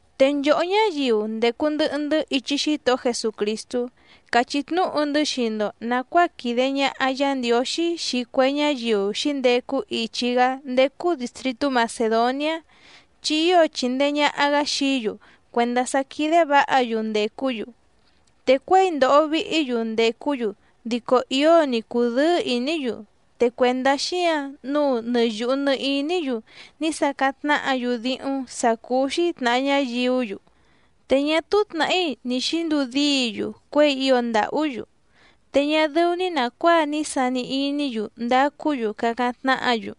Te nchòhó ñáyiu ndècu ndɨhɨ‑ndɨ́ ichi Xítohó Jesucrìstú càchí tnúhu‑ndɨ́ xii‑ndo nàcuáa quìde ñaha Yá Ndiǒxí xii cue ñáyiu xǐndecu ichi‑gá ndécú dìstritú Macèdoniá, chi ío chìndee ñaha‑gá xií‑yu cuèndá sá quídé vǎha‑yu ndècú‑yu. Te cuěi ndòho vihí‑yu ndècú‑yu dico ío‑ni cùdɨ́ɨ́ ìní‑yu, te cuèndá xíǎⁿ nǔu nɨ yùhu nɨ iní‑yu ní sacáⁿ tnáhǎ‑yu díhúⁿ sǎ cúú‑xí tnàha ñáyiú‑yu, te ñá túú tnàhí ni xǐnduu díi‑yu cuěi ío ndàhú‑yu. Te ñá dɨ́ú‑ní nàcuáa ní sani iní‑yu ndacú‑yu cacáⁿ tnáhǎ‑yu,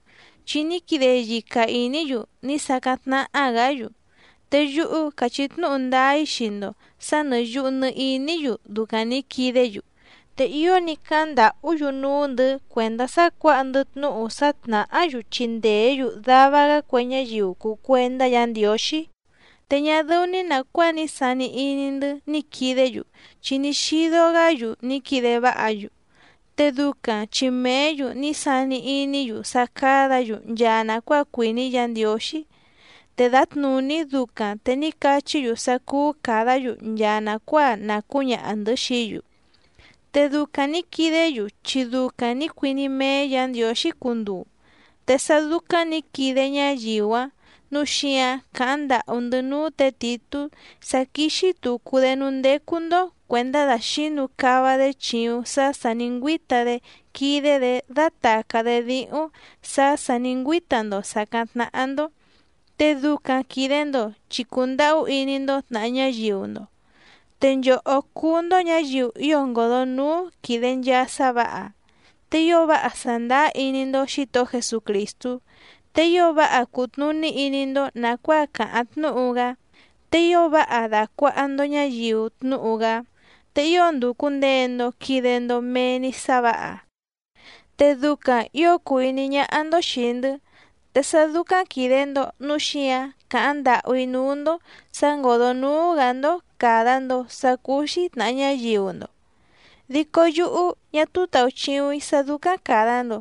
chi ní quide yica ìní‑yu ní sacáⁿ tnáhá‑gǎ‑yu, te yúhú càchí tnúhu ndáá‑í xii‑ndo sǎ nɨ̀ yuhu nɨ iní‑yu ducaⁿ nǐ quidé‑yu. Te ío ní cáháⁿ ndàhú‑yu núú‑ndɨ̌ cuèndá sá cuǎha‑ndɨ́ tnúhu sá tnàhá‑yu chindèé‑yu dava‑gá cue ñáyiu cùu cuendá Yǎ Ndiǒxí. Te ñá dɨ́ú‑ní nàcuáa ní sani iní‑ndɨ́ ní quìdé‑yu, chi ní xídó‑gǎ‑yu ní quide váha‑yu, te ducaⁿ chi mèé‑yu ní sani iní‑yu sá cádǎ‑yu nchaa nàcuáa cuìní Yǎ Ndiǒxí, te dǎtnùní ducaⁿ te ní cachí‑yu sá cúú càdá‑yu nchaa nàcuáa na cǔñaha‑ndɨ̌ xií‑yu. Te ducaⁿ nǐ quidé‑yu chi ducaⁿ nǐ cuiní méé Yǎ Ndiǒxí cunduu. Te sá dúcáⁿ nǐ quide ñáyiu‑áⁿ nǔu xíǎⁿ càháⁿ ndàhú‑ndɨ́ núú tě Tìtú sá quíxí tùcu‑dé núú ndécú‑ndó cuèndá dàxínu cava‑dé chìuⁿ sá sà ní ngüíta‑dé quídé‑dě dátàcá‑dé díhúⁿ sǎ sà ní ngüíta‑ndo sàcáⁿ tnáhá‑ndó, te ducaⁿ quìde‑ndo chi cùndahú iní‑ndó tnàha ñáyiu‑ndo. Te nchòhó cúú‑ndó ñǎyiu ío ngòdónúú quìde nchaa sá vǎha, te ío váha sàndáá iní‑ndó Xǐtohó Jesucrìstú, te ío váha cùtnuní iní‑ndó nàcuáa càháⁿ tnúhu‑gá, te ío váha dàcuaha‑ndo ñáyiu tnúhu‑gá, te ío ndùcu ndee‑ndo quide‑ndo mee‑ni sá vǎha, te ducaⁿ ǐo cùu iní ñáhá‑ndó xìi‑ndɨ́, te sá dúcáⁿ quìde‑ndo núu xíǎⁿ càháⁿ ndàhú‑í núú‑ndó sǎ ngòdó núú‑gǎ‑ndó càda‑ndo sá cúú‑xí tnàha ñáyiu‑ndo. Dico yúhú ñá túú tàuchiuⁿ‑í sá dúcáⁿ càda‑ndo,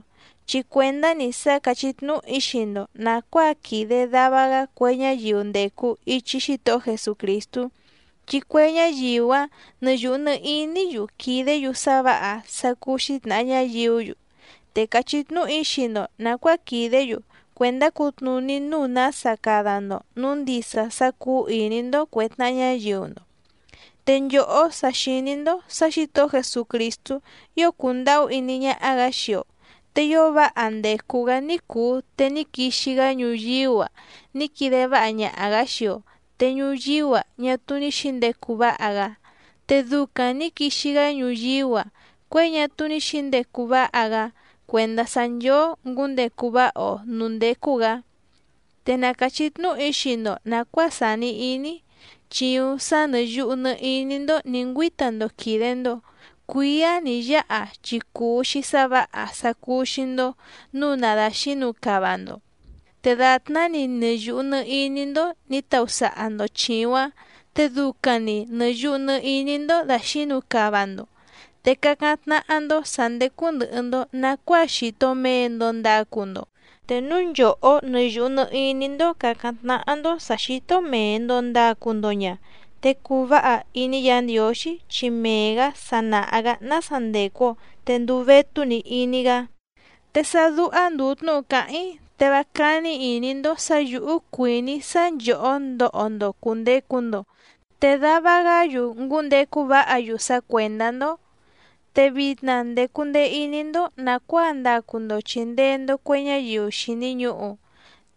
chi cuèndá‑ni sá càchí tnúhu‑í xii‑ndo nàcuáa quìde dava‑gá cue ñáyiu ndècu ichi Xítohó Jesucrìstú, chi cue ñáyiu‑áⁿ nɨ yùhu nɨ iní‑yu quìdé‑yu sá vǎha sá cúú‑xí tnàha ñáyiú‑yu, te càchí tnúhu‑í xii‑ndo nàcuáa quìdé‑yu cuèndá cutnùní nǔu nása cada‑ndo nǔu ndisa sá cúú ìní‑ndó cuè tnaha ñáyiu‑ndo. Te nchòhó sa xìní‑ndó sǎ Xǐtohó Jesucrìstú ío cùndahú iní ñáhá‑gǎ xii‑o, te ío váha ndècu‑gá ní cùu te ní quixi‑gá ñuyíú‑a ní quide váha ñaha‑gǎ xii‑o, te ñuyíú‑a ñá túú ní xǐndecu váha‑gá, te ducaⁿ nǐ quixi‑gá ñuyíú‑a cuěi ñá túú ní xǐndecu váha‑gá cuèndá sá nchóó ngǔndecu váha‑o nǔú ndécú‑gǎ. Te na càchí tnúhu‑í xii‑ndo nàcuáa sàni iní‑í. Chìuⁿ sá nɨ̀ yuhu nɨ iní‑ndó nǐ ngüíta‑ndo quìde‑ndo cuíá nì yáha chi cùu‑xi sá vǎha sá cúú‑xí‑ndó nǔu na dàxínu cava‑ndo. Te dàtná‑ni nɨ yùhu nɨ iní‑ndó nǐ tausaha‑ndo chìuⁿ‑áⁿ te ducaⁿ‑ni nɨ̀ yuhu nɨ iní‑ndó dàxínu cava‑ndo, te cacáⁿ tnáhá‑ndó sǎ ndécú ndɨ̀hɨ‑ndo nacuáa xìto mee‑ndo ndacu‑ndo. Te núu nchòhó nɨ yùhu nɨ iní‑ndó càcáⁿ tnáhá‑ndó sǎ xító mèe‑ndo ndacu‑ndo ña, te cùu váha iní Yǎ Ndiǒxí, chi mee‑gǎ sa nàha‑gá nása ndècu‑o te ndùu vétú‑ni iní‑gá. Te sá dúhá ndùu tnúhu càháⁿ‑í te vá cání ìní‑ndó sǎ yǔhú cuìní‑í sá nchòhó ndoho‑ndo cùndecu‑ndo te dava‑gá‑yu ngúndecu váha‑yu sá cuèndá‑ndó. Te vitna ndècu ndee iní‑ndó nàcuáa ndacu‑ndo chìndee‑ndo cue ñáyiu xìni ñuhu,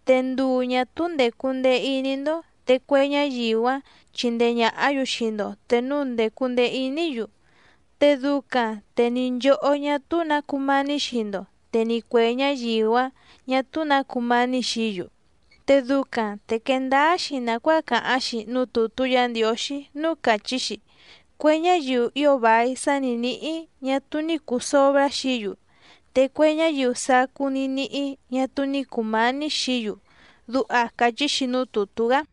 te nduu ñà túú ndècu ndee iní‑ndó te cue ñáyiu‑áⁿ chindee ñàhá‑yu xii‑ndo te núu ndècu ndee iní‑yu, te ducaⁿ te ni nchòhó ñá túú nǎ cumání xii‑ndo te ni cuè ñáyiu‑ǎⁿ ñá túú nǎ cumání xií‑yu. Te ducaⁿ te quee ndáá‑xi nàcuáa càháⁿ‑xi núú tùtú Yǎ Ndiǒxí núú càchí‑xi: “Cue ñáyiu ío vài sá ni nǐhí ñá túú ní cùu sobrá xií‑yu, te cue ñáyiu sacú ní níhí ñá túú ní cùmání xií‑yu”, duha càchí‑xi núú tùtú‑gá.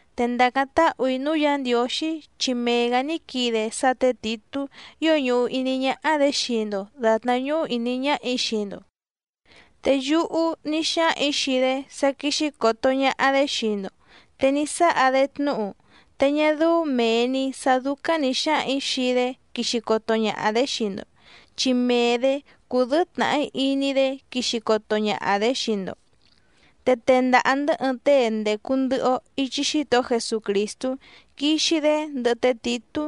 Te ndàcáⁿ táhù‑í núú Yǎ Ndiǒxí chi mee‑gǎ ní quide sá tě Tìtú ío ñùhu iní ñáhá‑dě xii‑ndo dàtná ñúhú ìní ñáhà‑í xii‑ndo. Te yúhú ní xáhaⁿ‑ǐ xii‑dé sá quíxí còto ñaha‑dé xii‑ndo te ní sáha‑dé tnúhu, te ñá dɨ́ú mèe‑ni sá dúcáⁿ nǐ xáhaⁿ‑ǐ xii‑dé quixi coto ñaha‑dě xii‑ndo, chi mee‑dě cúdɨ̌ɨ́ tnàhí iní‑dé quixi coto ñaha‑dě xii‑ndo. Te tendaha‑ndɨ̌ ɨɨⁿ tée ndècu ndɨhɨ‑o ichi Xítohó Jesucrìstú quixi‑dé ndɨhɨ té Tìtú,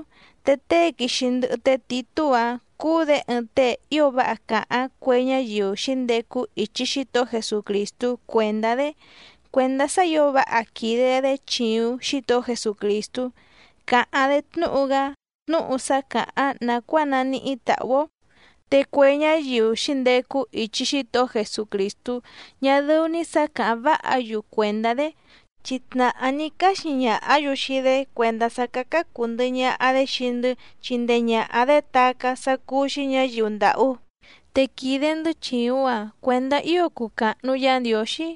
te tée quixi ndɨhɨ té Tìtú‑áⁿ cúú‑dě ɨɨⁿ tée ío váha càháⁿ cue ñáyiu xǐndecu ichi Xítohó Jesucrìstú cuèndá‑dé cuèndá sá ǐo váha quìde‑dé chìuⁿ Xítohó Jesucrìstú càháⁿ‑dé tnúhu‑gá tnúhu sá càháⁿ nàcuáa naníhí tàhú‑ó. Te cue ñáyiu xǐndecu ichi Xítohó Jesucrìstú ñá dɨ́ú‑ní sǎ càháⁿ váha‑yu cuèndá‑dé, chi tnàhá ní cáxi ñàhá‑yu xii‑dé cuèndá sá cácá cùu ndɨhɨ ñaha‑dé xii‑ndɨ́ chindee ñàha‑dé tacá sá cúú‑xí ñǎyiu ndàhú, te quìde‑ndɨ́ chìuⁿ‑a cuendá ío cuu càhnu Yá Ndiǒxí,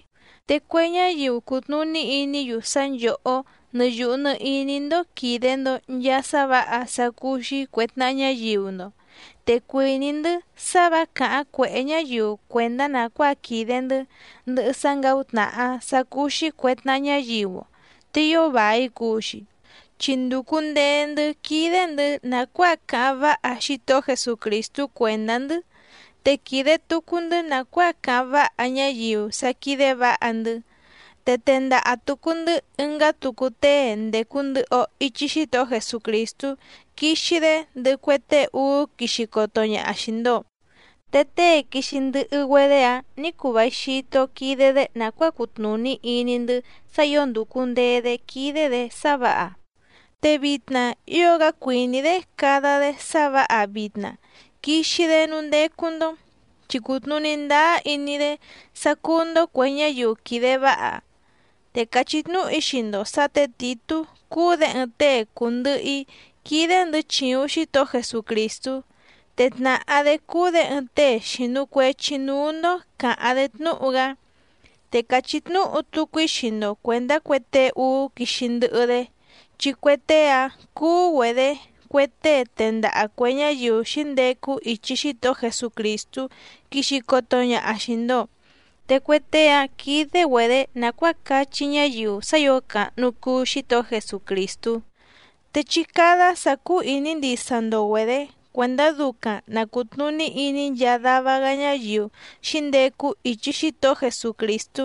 te cue ñáyiu cutnùní iní‑yu sá nchòhó nɨ yùhu nɨ iní‑ndó quìde‑ndo nchaa sá vǎha sá cúú‑xí cuè tnaha ñáyiu‑ndo. Te cuìní‑ndɨ́ sá vǎ càháⁿ cuèhé ñáyiu cuèndá nàcuáa quìde‑ndɨ́ ndɨhɨ sá ngǎutnàha sá cúú‑xí cuè tnaha ñáyiu‑o, te ío vài cuu‑xi. Chi ndùcu ndee‑ndɨ́ quídé‑ndɨ̌ nàcuáa cáháⁿ váha Xítohó Jesucrìstú cuèndá‑ndɨ́, te quìde tucu‑ndɨ́ nàcuáa cáháⁿ váha ñáyiu sá quídé vǎha‑ndɨ́. Te tendaha tùcu‑ndɨ́ ɨngá tucu tée ndècu ndɨhɨ‑o ichi Xítohó Jesucrìstú quixi‑dé ndɨhɨ cue tée úú quixi coto ñaha xìi‑ndo, te tée quixi ndɨhɨ‑güedé‑áⁿ nǐ cuu vài xito quide‑dé nàcuáa cutnùní iní‑ndɨ́ sá ǐo ndùcu ndee‑dé quídé‑dě sá vǎha, te vitna ío‑gá cuìní‑dé cada‑dé sá vǎha vitna quixi‑dé núú ndécú‑ndó, chi cùtnuní ndáá iní‑dé sá cúú‑ndó cuè ñáyiu quìde váha. Te càchí tnúhu‑í xii‑ndo sǎ tě Tìtú cúú‑dě ɨɨⁿ tée cùndɨhɨ‑í quídé‑ndɨ̌ chìuⁿ Xítohó Jesucrìstú, te tnàhá‑dé cúú‑dě ɨɨⁿ tée xìnu cuechi núú‑ndó càháⁿ‑dé tnúhu‑gá. Te càchí tnúhu tucu‑í xii‑ndo cuèndá cue tée úú quixi ndɨhɨ‑dé, chi cue tée‑áⁿ cúú‑güedě cue tée tendaha cuè ñáyiu xǐndecu ichi Xítohó Jesucrìstú quixi coto ñaha xìi‑ndo. Te cue tée‑áⁿ quídé‑güedě nàcuáa cachí ñáyiu sá ǐo càhnu cuu Xítohó Jesucrìstú. Te chí cádá sǎ cúú ìní ndisa‑ndo‑güedě cuèndá ducaⁿ na cùtnuní iní nchaa dava‑gá ñáyiu xǐndecu ichi Xítohó Jesucrìstú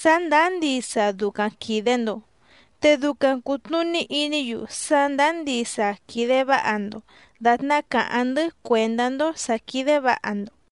sá ndàá ndisa ducaⁿ quìde‑ndo, te ducaⁿ cùtnuní iní‑yu sá ndàá ndisa quìde váha‑ndo dàtná càháⁿ‑ndɨ́ cuèndá‑ndó sǎ quídé vǎha‑ndo.